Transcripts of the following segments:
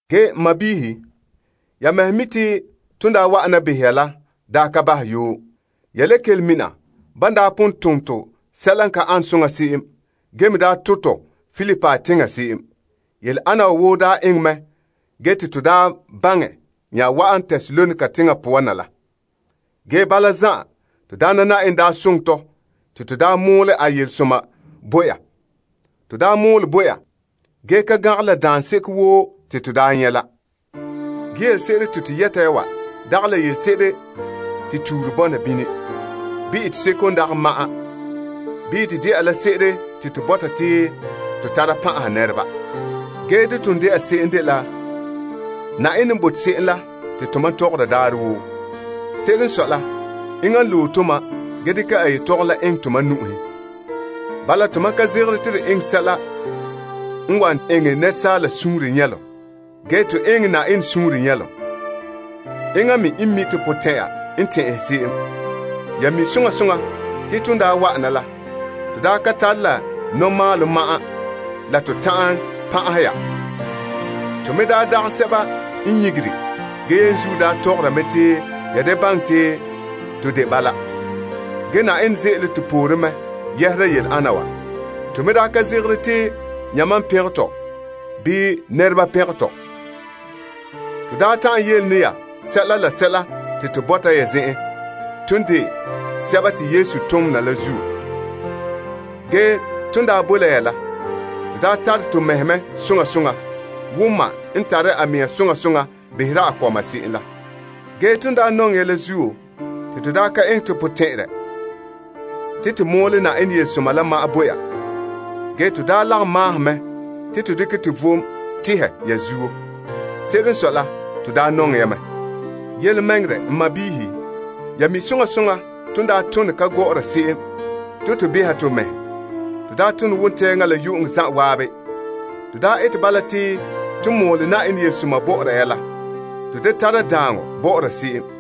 Ge n sɔɔnrɔ, ya mɛhe mi' te ton daa wa'ana behɛ ya la daa ka bahɛ yoo. Ya le kelom mina ban daa pon tom tɔ sɛla n ka ane soŋa se'em ge me daa to' tɔ Filipi teŋa se'em. Yele ana wa woo daa eŋɛ mɛ ge te to daa nya wa'an Tesalonika teŋa poan na la. Ge bala zan'an, to Yenɛ daa soŋɛ tɔ te to daa mɔɔlɛ a yelesoma bo ya. To daa mɔɔlɛ bo ya ge ka gangɛ la daanseko woo te to daa nyɛ' la. Ge yelese'ere te to yɛta ya wa dagɛ la yelese'ere te tuure bɔna bini, bii eteseko n dagɛ ma'an, bii de dɛna la se'ere te to bɔta te to tara pan'aha nɛreba. Dene n de se'em la dela Yenɛ n bote se'em la te tomam tɔgɔra daarɛ woo. Se'ere n sɔe la, enŋa n loe tomam ge dekɛ a yetɔgom la eŋɛ to nu'uhen. Bala, tomam ka zegere to eŋɛ la sɛla n wan eŋɛ nɛresaaleba suunre nyɛlom. Ge, to eŋɛ Yenɛ suunre nyɛlom. Enŋa me n mi' to potɛn'ɛra n tɛn'ɛhɛ se'em. Ya mi' soŋa soŋa te ton daa wa'ana la, to daa ka tare la nɔmalehom ma'an la to ta'an pan'ahɛ ya. To me daa dagɛ sɛba n nyigere ge yenzuo daa tɔgɔra mɛ te ya da baŋɛ te to de bala. Ge Yenɛ ze'ele to poore mɛ yɛhera yele ana wa. To me daa ka zegere te yamam n pɛngɛ tɔ bii nɛresɛba pɛngɛ tɔ. To daa ta'an yele ne ya sɛla te to bɔta ya zen'en ton de Krista tontoneba la zuo. Ge ton daa boe la ya la, to daa tare to mɛhe mɛ soŋa soŋa wo ma n tare a mɛŋa soŋa soŋa behera a kɔma se'em la. Ge ton daa nɔŋɛ ya la zuo te to daa ka eŋɛ to potɛn'ɛrɛ te to mɔɔlɛ Yenɛ yelesoma la ma'an bo ya. Ge, to daa lagom maahom mɛ te to dekɛ to vom tehɛ ya zuo. Se'ere n sɔe la, to daa nɔŋɛ ya mɛ. Yelemɛŋɛrɛ to sɔɔnrɔ, ya mi soŋa soŋa ton daa tone ka gɔ'ɔra se'em te to beha to mɛhe. To daa tone wontɛɛŋa la yu'uŋɔ zan'an. To daa ete bala te ton mɔɔlɛ Yenɛ yelesoma bɔ'ɔra ya la, to da tara daaŋɔ bɔ'ɔra se'em.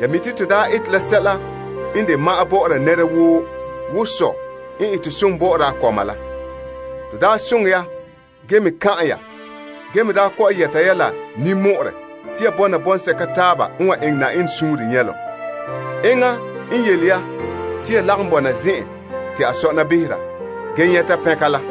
Ya mi te to daa ete la sɛla n de ma'an bɔ'ɔra nɛra woo wo sɔ n ete se'em bɔ'ɔra a kɔma la. To daa soŋɛ ya ge me kan'an ya ge me daa kɔ'ɔn yɛta ya la ninmɔ'ɔrɛ te ya bɔna bɔŋsɛka taaba n wan eŋɛ Yenɛ suunre nyɛlom. Enŋa n yele ya te ya lagom bɔna zen'an te a sɔna behera ge nyɛta pɛnka la.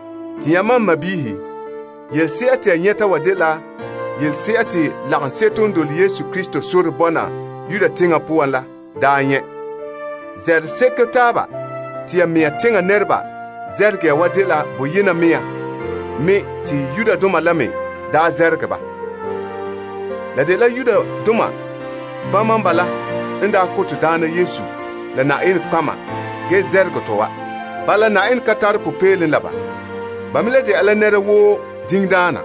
Te yamam n sɔɔnrɔ, yelese'a te ya nyɛta wa dela yelese'a te lagaŋseto n dole Yenɛ sore n bo Krista Yesu bɔna Yudea teŋa poan la daa nyɛ'. Namehe se'ere taaba te ya mɛŋa teŋa nɛreba namehe ya wa dela boyena mea me te Yudoma la me daa namehe ba. La dela Yudoma bama n bala n daa ko Na'ayenɛ Yesu la nɔtɔgɔheba ge namehe tɔ wa. Bala, Yenɛ ka tare popeelom la ba. Ba me le dɛna la nɛra woo diŋdaana.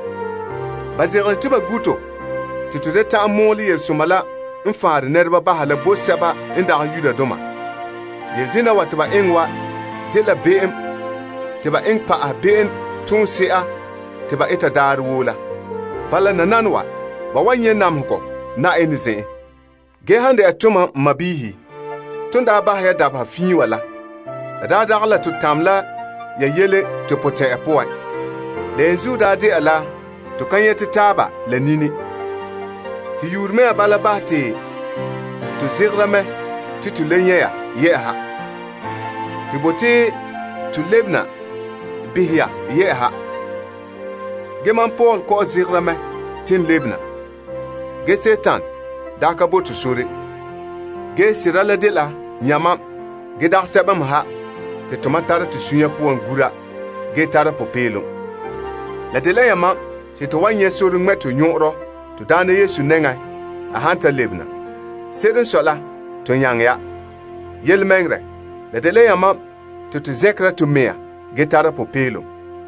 Ba zegere te ba gu' to te to da ta'an mɔɔlɛ yelesoma la n faanrɛ nɛreba baha la bo sɛba n dagɛ Yudoma. Yele dena wa te ba eŋɛ wa dela be'em te ba eŋɛ pa'ahɛ be'em toonse'a te ba eta daarɛ woo la. Bala nananawa, ba wan nyɛ' namehegɔ Yenɛ zen'en. Ge han dɛna tomam n sɔɔnrɔ, ton daa bahɛ ya dabeha fiin wa la, la daa dagɛ la to daa tamɛ la ya yele to potɛn'ɛra poan. La yenzuo daa de'a la to ka nyɛte taaba la nini. To nyuunre mea bala bahɛ tɔ te to zegera mɛ to to le nyɛ' ya yɛ'ɛha. To bote te to lebena behɛ ya yɛ'ɛha. Mam Paul daa zegere mɛ te n lebe na. Ge, Dima la daa ka bo to sore. Ge sera la dela yamam ge dagɛ sɛba me ha te tomam tara to suunre poan gura ge tara popeelom. La dela yamam te to wan nyɛ' sore ŋmɛ' to nyɔn'ɔnrɔ to Na'ayenɛ Yesu nɛŋan a han ta lebena. Se'ere n sɔe la, to nyaŋɛ ya. Yelemɛŋɛrɛ, la dela yamam te to zɛnkera to mɛŋa ge tara popeelom.